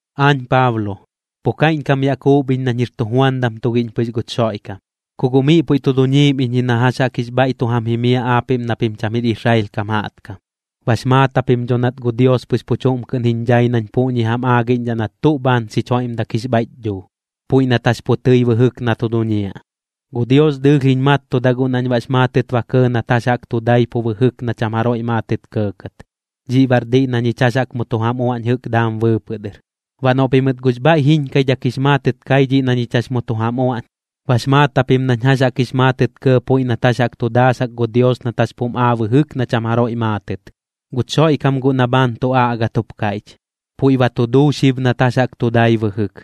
Aañ Paablo, pu kaiꞌñkam yaꞌ kuup iñ nañ jir tujuandam tugiꞌñ pɨx guch Xoiꞌkam, ku guꞌ miꞌ puiꞌ tu duñiim iñ ji na jax jaꞌk jix bhaiꞌ tu jam jimiaꞌ aapiꞌm na pim cham jir Israel kam jaꞌtkam. Bax maat japim dho nat gu Dios pɨx pu chuꞌm kɨꞌn jiñ dhai nañ puꞌñi jam aagiꞌñdhaꞌ nat tuꞌ bhaan xich joiꞌmdak jix bhaiꞌch dhuu, puiꞌ nat jax pu tɨi bɨjɨk na tu duñiaꞌ. Gu Dios dɨɨlh jiñ mattuda guꞌ nañ baꞌx maatɨt ba kɇɇ nat jax jaꞌk tu dai pu bɨjɨk na cham jaroiꞌ maatɨt kɇɇkɇt. Dhiꞌ baꞌr diꞌ na ñich jax jaꞌk mu tu jam uaꞌñ jɨꞌk daam bɨɨpɨꞌ dɨr. Baꞌ noꞌ pimɨt guꞌx bhaiꞌ jiñkaidhak jix maatɨt kai dhiꞌ na ñich jax mu tu jam uaꞌñ, bax maat japim nañ jax jaꞌk jix maatɨt kɇɇ puiꞌ nat jax jaꞌk tu daasak gu Dios nat jax pum aa bɨjɨk na cham jaroiꞌ maatɨt. Guch Xoiꞌkam guꞌ na bhaan tu aꞌgat jup kaiꞌch, puiꞌ ba tu duu xib nat jax jaꞌk tu dai bɨjɨk.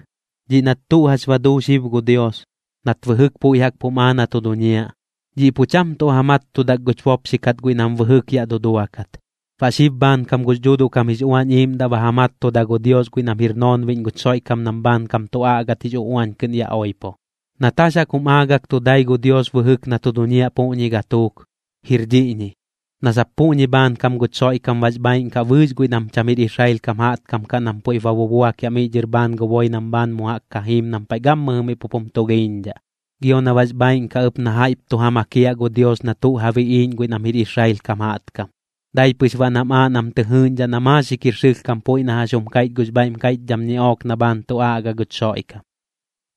Dhiꞌ nat tuꞌ jax ba duu xib gu Dios, nat bɨjɨk puiꞌ jaꞌk pum aa na tu duñiaꞌ, dhiꞌ pu cham tuꞌ ja mattudak guch bopxi kat guiꞌ nam bɨjɨk yaꞌ tu duduakat. Baꞌ xib bhaankam gux Dhuuduꞌ kam jix Uañ Iiꞌmdaꞌ ba ja mattuda gu Dios guiꞌ nam jir noonbiꞌñ guch Xoiꞌkam nam bhaankam tu aꞌgat jix uꞌuañ kɨꞌn yaꞌ oipo. Nat jax jaꞌk jum aagak tu dai gu Dios bɨjɨk na tu duñiaꞌ puꞌñi gatuuk, jir dhiꞌñi: Na sap puꞌñi bhaankam guch Xoiꞌkam bax bhaaiꞌn kaꞌ bɨɨx guiꞌ nam jɨꞌk cham jir Israel kam jaꞌtkam kaꞌ nam puiꞌp ba bubuakiaꞌ miꞌ dhɨr bhaan gu boi nam bhaan mu jaꞌk jiim nam paiꞌ gammɨjɨ miꞌ pup jum tulhiiñdhaꞌ. Gio na bax bhaaiꞌn kaꞌ ɨp na jaiꞌp tu ja makiaꞌ gu Dios na tuꞌ ja biꞌiiꞌñ guiꞌ nam jir Israel kam jaꞌtkam, dai pɨx baꞌ nam aaꞌ nam tɨ jɨɨꞌñdhaꞌ na maaxik jir sɨlhkam puiꞌ na jax jum kaiꞌch gux bhaiꞌm kaiꞌchdham ñiꞌook na bhaan tu aꞌga guch Xoiꞌkam.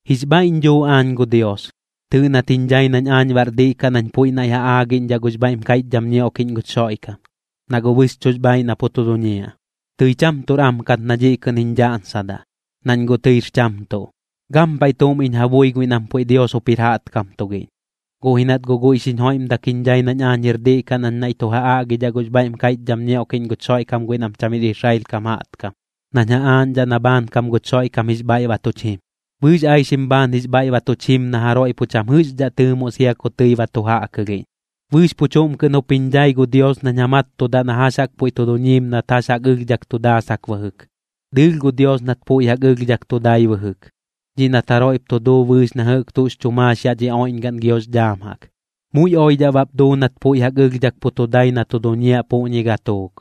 Jix bhaiꞌñ dhuu aañ gu Dios, tɨɨꞌ nat jiñ dhai nañ aañ baꞌr diꞌ kaꞌ nañ puiꞌ naiꞌ ja aagiꞌñdhaꞌ gux bhaiꞌm kaiꞌchdham ñioꞌkiꞌñ guch Xoiꞌkam, na guꞌ bɨxchuꞌx bhaaiꞌ na pu tu duñiaꞌ. Tɨi cham tuꞌr am kat na dhiꞌ kɨꞌn jiñ dhaꞌñsadaꞌ, nañ guꞌ tɨir cham tuꞌ, gampaiꞌ tuꞌm iñ ja bui guiꞌ nam puiꞌ Dios jup jir jaꞌtkam tugiꞌñ. Guꞌ ji nat guꞌ guiꞌ xiñ joiꞌmdak jiñ dhai nañ aañ jir diꞌ kaꞌ nañ naiꞌ tu ja aꞌgidhaꞌ gux bhaiꞌm kaiꞌchdham ñioꞌkiꞌñ guch Xoiꞌkam guiꞌ nam cham jir Israel kam jaꞌtkam, nañ ja aaꞌñdhaꞌ na bhaankam guch Xoiꞌkam jix bhaiꞌ ba tuch jim. Bɨɨx aixim bhaan jix bhaiꞌ ba tuch jim na jaroiꞌ pu cham jɨꞌxdhaꞌ tɨɨmoꞌ sia ku tɨi ba tu jaꞌkɨlhiꞌñ. Bɨɨx pu chuꞌm kɨꞌn jup jiñ dhai gu Dios nañ ja mattudaꞌ na jax jaꞌk puiꞌ tu duñiim nat jax jaꞌk ɨlhdhak tu daasak bɨjɨk. Dɨɨlh gu Dios nat puiꞌ jaꞌk ɨlhdhak tu dai bɨjɨk, dhiꞌ nat jaroiꞌp tu duu bɨɨx na jɨꞌk tuꞌx chu maax yaꞌ dhi oiꞌñgaꞌn giox dhaam jaꞌk. Muiꞌ oidhaꞌ bap duu nat puiꞌ jaꞌk ɨlhdhak pu tu dai na tu duñiaꞌ puꞌñi gatuuk.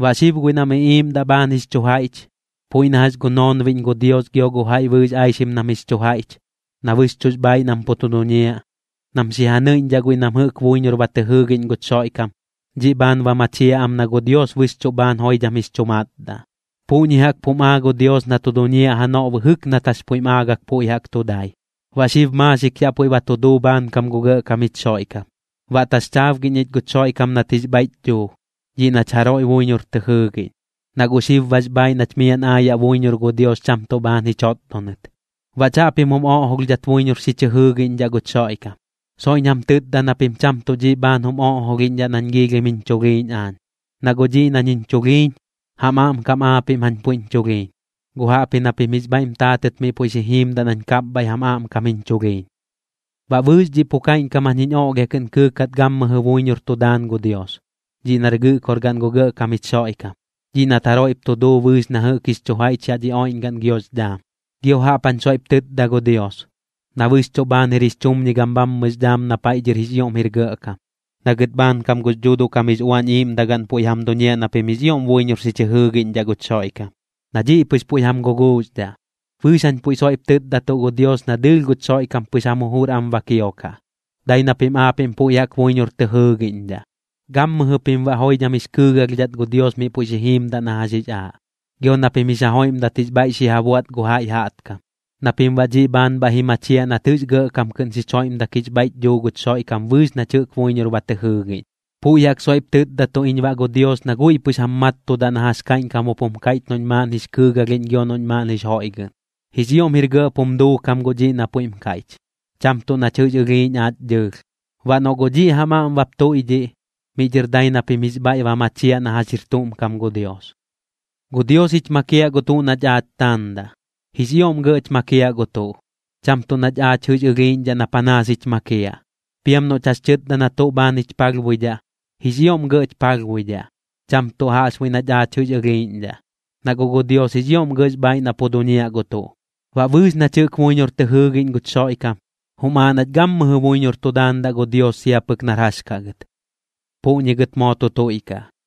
Baꞌ xib guiꞌ nam iꞌiiꞌmdaꞌ bhaan jix chu jaiꞌch, puiꞌ na jax gu noonbiꞌñ gu Dios gio gu jaiꞌ bɨɨx aixim nam jix chu jaiꞌch, na bɨxchuꞌx bhaaiꞌ nam pu tu duñiaꞌ, nam xi ja nɨiꞌñdhaꞌ guiꞌ nam jɨꞌk buiñor ba tɨ jɨɨgiꞌñ guch Xoiꞌkam, dhiꞌ bhaan ba machiaꞌ am na gu Dios bɨxchuꞌ bhaan joidham jix chu matdaꞌ. Puꞌñi jaꞌk pum aa gu Dios na tu duñiaꞌ janoꞌ bɨjɨk nat jax puiꞌm aagɨk puiꞌ jaꞌk tu dai, baꞌ xib maaxik yaꞌ puiꞌ ba tu duu bhaankam gu Gɇꞌkam jich Xoiꞌkam. Baꞌ taxchaabgiꞌñ ich guch Xoiꞌkam nat jix bhaiꞌch dhuu, dhiꞌ nach jaroiꞌ buiñor tɨ jɨɨgiꞌñ, na guꞌ xib bax bhaaiꞌ nach miaꞌn aayaꞌ buiñor gu Dios cham tuꞌ bhaan ji chotdonɨt. Baꞌ chaꞌpim jum oꞌjolhdhat buiñor xi chɨ jɨɨgiꞌñdhaꞌ guch Xoiꞌkam. Soiꞌñ jam tɨtda na pim cham tuꞌ dhiꞌ bhaan jum oꞌjolhiꞌñdhaꞌ nañ giilhim jiñ chulhiiñ aañ, na guꞌ dhiꞌ nañ jax jiñ chulhiiñ, jam aꞌmkam aapiꞌm jañ puiꞌñ chulhiiñ. Guꞌ jaꞌpji na pim jix bhaiꞌm taatɨt miꞌ puiꞌ xi jiimdaꞌ nañ kapbhaiꞌ jam aꞌmkam jiñ chulhiiñ. Baꞌ bɨɨx dhiꞌ pu kaiꞌñkam jañ jiñ oꞌlhia kɨꞌn kɨɨkat gammɨjɨ buiñor tu daan gu Dios, dhiꞌ nar Gɨꞌkorgaꞌn gu Gɇꞌkam jich Xoiꞌkam, dhiꞌ nat jaroiꞌp tu duu bɨɨx na jɨꞌk jix chu jaiꞌch yaꞌ dhi oiꞌñgaꞌn giox dhaam. Gio jaꞌp jañ soiꞌp tɨtda gu Dios, na bɨxchuꞌ bhaan jir jix chumñigam bhammɨx dhaam na paiꞌ dhɨr jix ioꞌm jir Gɇꞌkam, na gɨt bhaankam gux Dhuuduꞌ kam jix Uañ Iiꞌmdagaꞌn puiꞌ jam duñiaꞌ na pim jix ioꞌm buiñor xi chɨ jɨɨgiꞌñdhaꞌ guch Xoiꞌkam, na dhiꞌ pɨx puiꞌ jam guguuxdhaꞌ. Bɨɨx jañ puiꞌ soiꞌp tɨtdatuꞌ gu Dios na dɨɨlh guch Xoiꞌkam pɨx jam jujur am ba kiokaꞌ, dai na pim aapiꞌm puiꞌ jaꞌk buiñor tɨ jɨɨgiꞌñdhaꞌ. Gammɨjɨ pim baꞌ joidham jix kɨɨgalhdhat gu Dios miꞌ puiꞌ xi jiimdaꞌ na jax jix aaꞌ, gio na pim jix ja joiꞌmdat jix bhaiꞌ xi ja buaꞌt gu jaiꞌ jaꞌtkam na pim baꞌ dhiꞌ bhaan bhaiꞌ ji machiaꞌ nat jɨꞌx gɇꞌkam kɨꞌn xich joiꞌmdak jix bhaiꞌch dhuu guch Xoiꞌkam bɨɨx nach jɨꞌk buiñor ba tɨ jɨɨgiꞌñ. Puiꞌ jaꞌk soiꞌp tɨtdatuꞌ iñ baꞌ gu Dios na guiꞌ pɨx jam mattudaꞌ na jax kaiꞌñkam jup jum kaiꞌch noꞌñ maaꞌn jix kɨɨgalhiꞌñ gio noꞌñ maaꞌn jix joiꞌgɨꞌn. Jix ioꞌm jir gɇꞌp jum duukam guꞌ dhiꞌ na puiꞌm kaiꞌch, cham tuꞌ nach jɨꞌx ɨlhiiꞌñ aach dhɨɨlh. Baꞌ noꞌ guꞌ dhiꞌ jam aꞌm bap tuiꞌdhiꞌ, miꞌ dhɨr dai na pim jix bhaiꞌ ba machiaꞌ na jax jir tuꞌm kam gu Dios. Gu Dios jich makiaꞌ gu tuꞌ nach aach taandaꞌ. Jix ioꞌm gɇꞌch makiaꞌ gu tuꞌ, cham tuꞌ nach aach jɨꞌx ɨlhiiꞌñdhaꞌ na panaas jich makiaꞌ. Piam noꞌch jax chɨtda na tuꞌ bhaan jich palhbuidhaꞌ, jix ioꞌm gɇꞌch palhbuidhaꞌ, cham tuꞌ jaꞌxbuiꞌ nach aach jɨꞌx ɨlhiiꞌñdhaꞌ, na guꞌ gu Dios jix ioꞌm gɇꞌx bhaaiꞌ na pu duñiaꞌ gu tuꞌ. Baꞌ bɨɨx nach jɨꞌk buiñor tɨ jɨɨgiꞌñ guch Xoiꞌkam, jum aaꞌ nach gammɨjɨ buiñor tu daandaꞌ gu Dios sia pɨk nar jax kaꞌ gɨt. Puꞌñi gɨt moo tu tuiꞌkaꞌ.